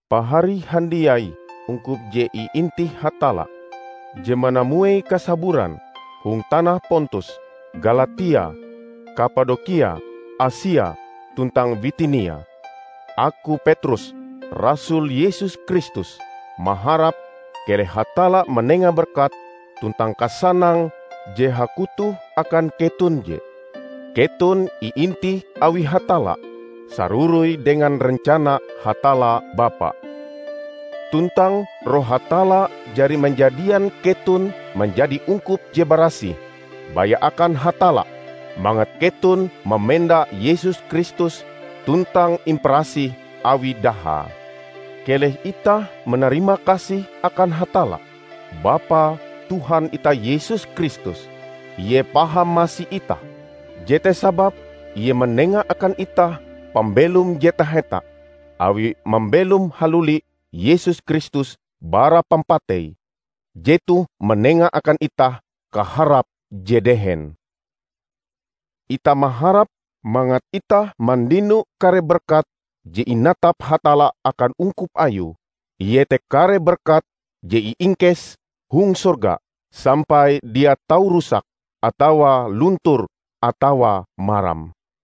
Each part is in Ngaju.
Pahari handiai ungkup je iintih Hatalla, je manamuei kasaburan hong tanah Pontus, Galatia, Kapadokia, Asia, tuntang Bitinia! Aku, Petrus, rasul Yesus Kristus, maharap keleh Hatalla manenga berkat tuntang kasanang je hakutoh akan keton je. Keton iintih awi Hatalla, saroroi dengan rencana Hatalla Bapa. Tuntang Roh Hatalla jari manjadian keton manjadi ungkup je barasih, baya akan Hatalla, mangat keton mamenda Yesus Kristus tuntang imparasih awi dahae. Keleh itah manarimakasih akan Hatalla, Bapa Tuhan itah Yesus Kristus! Ie paham masi itah, jete sababe ie manenga akan itah pambelom je taheta, awie mambelom haluli Yesus Kristus bara pampatei. Jetoh manenga akan itah kaharap je dehen. Itah maharap mangat itah mandino kare berkat je inatap Hatalla akan ungkup ayue, iete kare berkat je iingkes hong sorga, sampai dia tau rusak, atawa luntur atawa maram.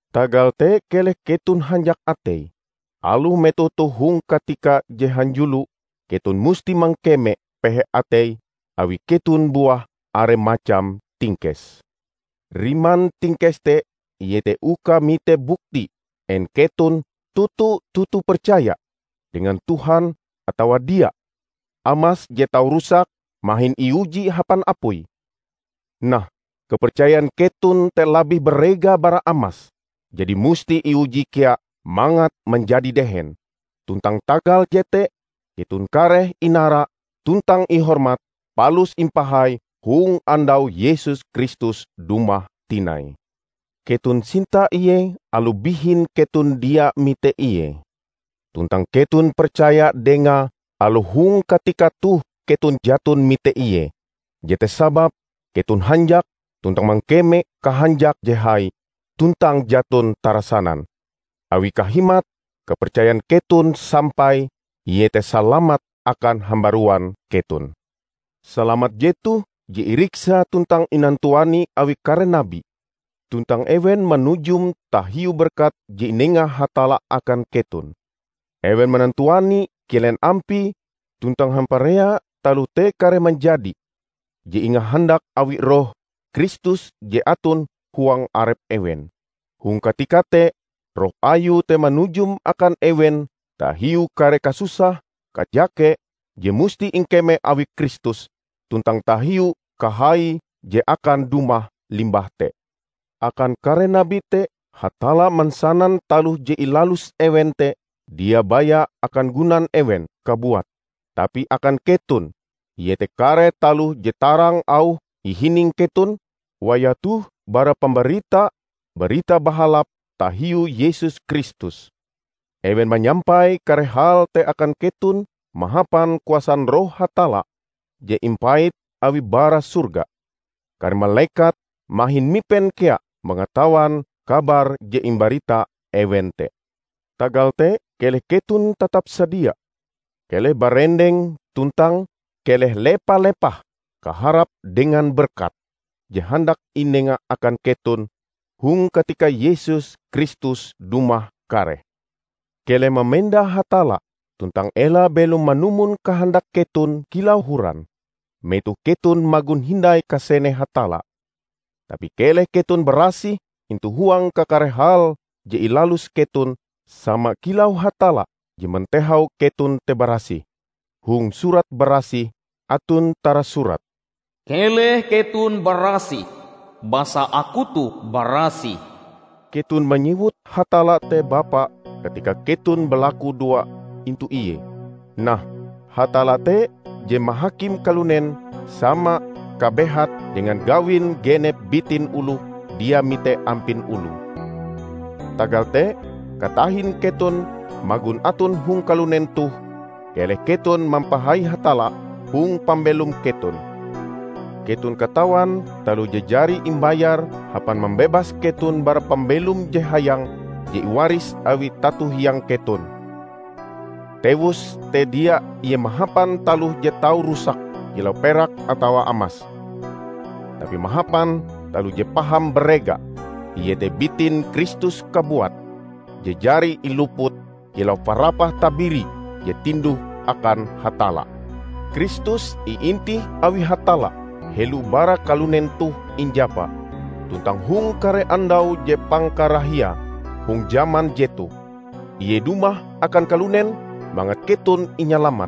Tagal te keleh keton hanjak atei, aloh metoh toh hong katika je hanjulo keton musti mangkeme pehe atei awi keton buah are macam tingkes. Riman tingkes te iete uka mite buktie en keton toto-toto percaya dengan Tuhan atawa dia. Amas je tau rusak mahin iuji hapan apui. Nah, kapercayan keton te labih barega bara amas, jadi musti iuji kea mangat manjadi dehen. Tuntang tagal jete keton kareh inara tuntang ihormat palus impahai hong andau Yesus Kristus dumah tinai. Keton sinta ie aloh bihin keton dia mite ie. Tuntang keton percaya dengae aloh hong katika toh keton jaton mite ie. Jete sababe keton hanjak, tuntang mangkeme kahanjak je hai tuntang jaton tarasanan. Awi kahimat kapercayan keton sampai, iete salamat akan hambaruan keton. Salamat jetoh je iriksa tuntang inantuani awi kare nabi, tuntang ewen manujum tahiu berkat je inenga Hatalla akan keton. Ewen manantuani kilen ampie tuntang hamparea taloh te kareh manjadi, je ingahandak awi Roh Kristus je aton huang arep ewen. Hong katika te Roh ayue te manujum akan ewen tahiu kare kasusah-kajake je musti ingkeme awi Kristus tuntang tahiu kahaie je akan dumah limbah te. Akan kare nabi te Hatalla mansanan taloh je ilalus ewen te dia baya akan gunan ewen kabuat, tapi akan keton; iete kare taloh je tarang auhe ihining keton wayah toh bara pambarita Barita Bahalap tahiu Yesus Kristus. Ewen manyampai kare hal te akan keton mahapan kuasan Roh Hatalla je impait awie bara sorga. Kare malekat mahin mipen kea mangatawan kabar je imbarita ewen te. Tagal te, keleh keton tatap sadia. Keleh barendeng tuntang keleh lepa-lepah kaharap dengan berkat je handak inenga akan keton hong katika Yesus Kristus dumah kareh. Keleh mamenda Hatalla, tuntang ela belom manumon kahandak keton kilau horan, metoh keton magon hindai kasene Hatalla. Tapi keleh keton barasih intu huang kakare hal je ilalus keton sama kilau Hatalla je mantehau keton te barasih. Hong Surat Barasih aton tarasurat, "Keleh keton barasih, basa aku toh barasih." Keton manyewut Hatalla te Bapa katika keton balakudoa intu Ie. Nah, Hatalla te je mahakim kalunen sama kabehate dengan gawin genep bitin oloh dia mite ampin oloe. Tagal te katahin keton magon aton hong kalunen toh, keleh keton mampahai Hatalla hong pambelom keton. Keton katawan taloh je jari imbayar hapan mambebas keton bara pambelom je hayang je iwaris awi tato hiang keton. Tewuse te dia ie mahapan taloh je tau rusak kilau perak atawa amas, tapi mahapan taloh je paham barega; iete bitin Kristus kabuat, je jari iluput kilau parapah tabiri je tinduh akan Hatalla. Kristus iintih awi Hatalla helo bara kalunen toh injapa. Tuntang hong kare andau je pangkarahiae hong jaman jetoh, ie dumah akan kalunen mangat keton inyalamat.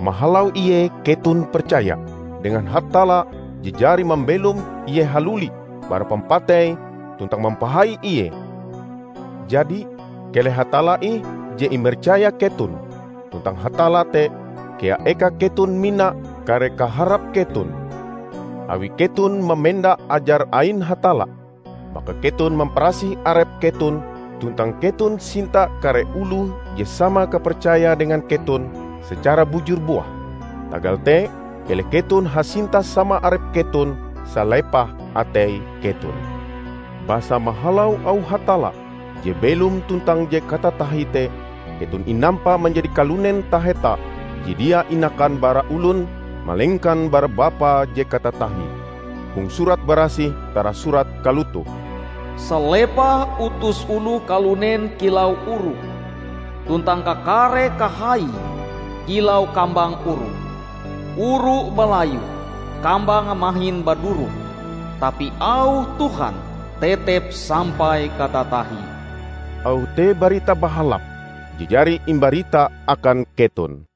Mahalau ie keton percaya dengan Hatalla je jari mambelom ie haluli bara pampatei tuntang mampahai ie. Jadi, Keleh Hatalla ih je imercaya keton tuntang Hatalla te kea eka keton mina kare kaharap keton. Awi keton mamenda ajar ain Hatalla, maka keton mamparasih arep keton tuntang keton sinta kare oloh je sama kapercayae dengan keton secara bujur buah. Tagal te keleh keton hasinta sama arep keton salepah atei keton. Basa mahalau auh Hatalla je belom tuntang je katatahie te, keton inampa manjadi kalunen taheta je dia inakan bara olon, malengkan bara Bapa je katatahie. Hong Surat Barasih tarasurat kalotoh, "Salepah utus oloh kalunen kilau oru, tuntang kakare kahaie kilau kambang oru. Oru balayu, kambange mahin baduroh; tapi auh Tuhan tetep sampai katatahie." Auh te Barita Bahalap je jari imbarita akan keton.